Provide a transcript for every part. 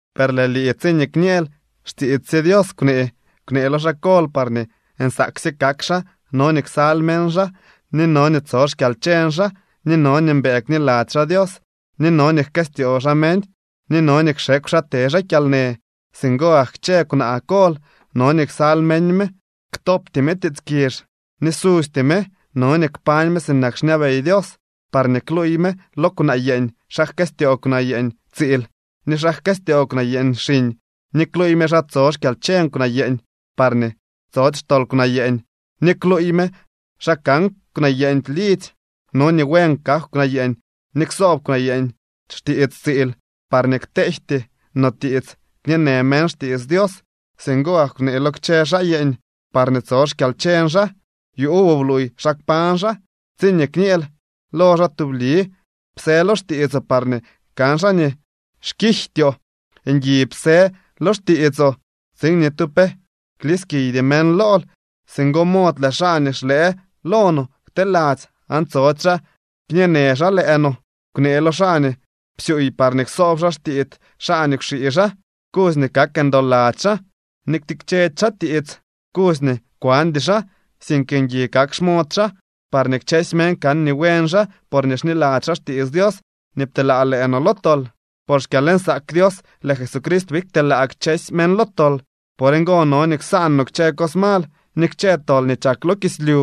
Per lëë lii, tsiñee kñeel, xtiits sye Dios kwnee. Kwnee lo xaa kol parñee nsaaksye kak xaa no nii ksal meñ xaa ni no nii tso xkyalcheñ xaa ni no nii mbëë kniladzy xaa Dios, ni no nii jkëstyoo xaa meñ ni no nii kxekw xaa te xaa kyalnë. Singo gak kchë kwnaa kol no nii ksal meñ me, ktopty me tiits kizh, ni susty me. No nii kpañ me sinak xñabey Dios, parñee kluuy me lo kwnaa yeeñ xa jkëstyoo kwnaa yeeñ tsiil, ni xa jkëstyoo kwnaa yeeñ xiñ, ni kluuy me xa tso xkyalcheñ kwnaa yeeñ, parñee tsody xtol kwnaa yeeñ, ni kluuy me xa kan kwnaa yeeñ lidzy. No nii buen kak kwnaa yeeñ ni ksoob kwnaa yeeñ xtiits tsiil, parñee kteejty no tiits kñeenë meñ xtiits Dios. Singo gak kwnee lo kchë xaa yeeñ parñee tso xkyalcheñ xaa, yuuboo bluuy xa kpañ xaa. Tsiñee kñeel lo xaa tubli psë lo xtiitsoo parñee kan xaa nii xkijtyoo. Ngui psë lo xtiitsoo tsiin ni tu pe kliskiydy meñ lool. Singo mod lëë xaa nii xlëë lo no kteladzy aan tsody xa kñeenë xaa lëë no. Kwnee lo xaa nii psyuuy parñee ksoob xaa xtiits xaa nii kwxii xaa, kudzy nii kak ndoladzy xaa ni ktikchedy xaa tiits. Kudzy nii kwandy xaa, sink ngui kak xmod xaa, parñee kchësy meñ kan nii buen xaa porñee xniladzy xaa xtiits Dios nii pteelaa lëë no lo tol. Por xkyalnsaak Dios lëë Jesucrist biid kteelaa kchësy meñ lo tol. Por ngo no nii ksaan no kchë cos mal ni kchë tol nii chak lo kislyu,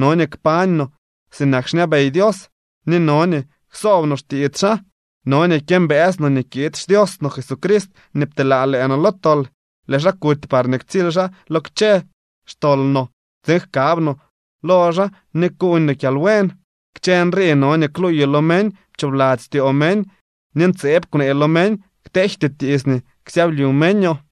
no nii kpañ no sinak xñabey Dios ni no nii ksoob no xtiits xaa. No nii kyëmbëës no nii kiid xDios no Jesucrist nii pteelaa lëë no lo tol. Lëë xaa kuty parñee ktsily xaa lo kchë xtol no, tsiin jkab no lo xaa ni kuuñ no kyalbuen. Kchë nrii no nii kluuyoo lo meñ. Pchoobladzy styoo meñ ni ntseeb kwnee lo meñ. Ktejtyoo tiits nii ksyablyu meñoo.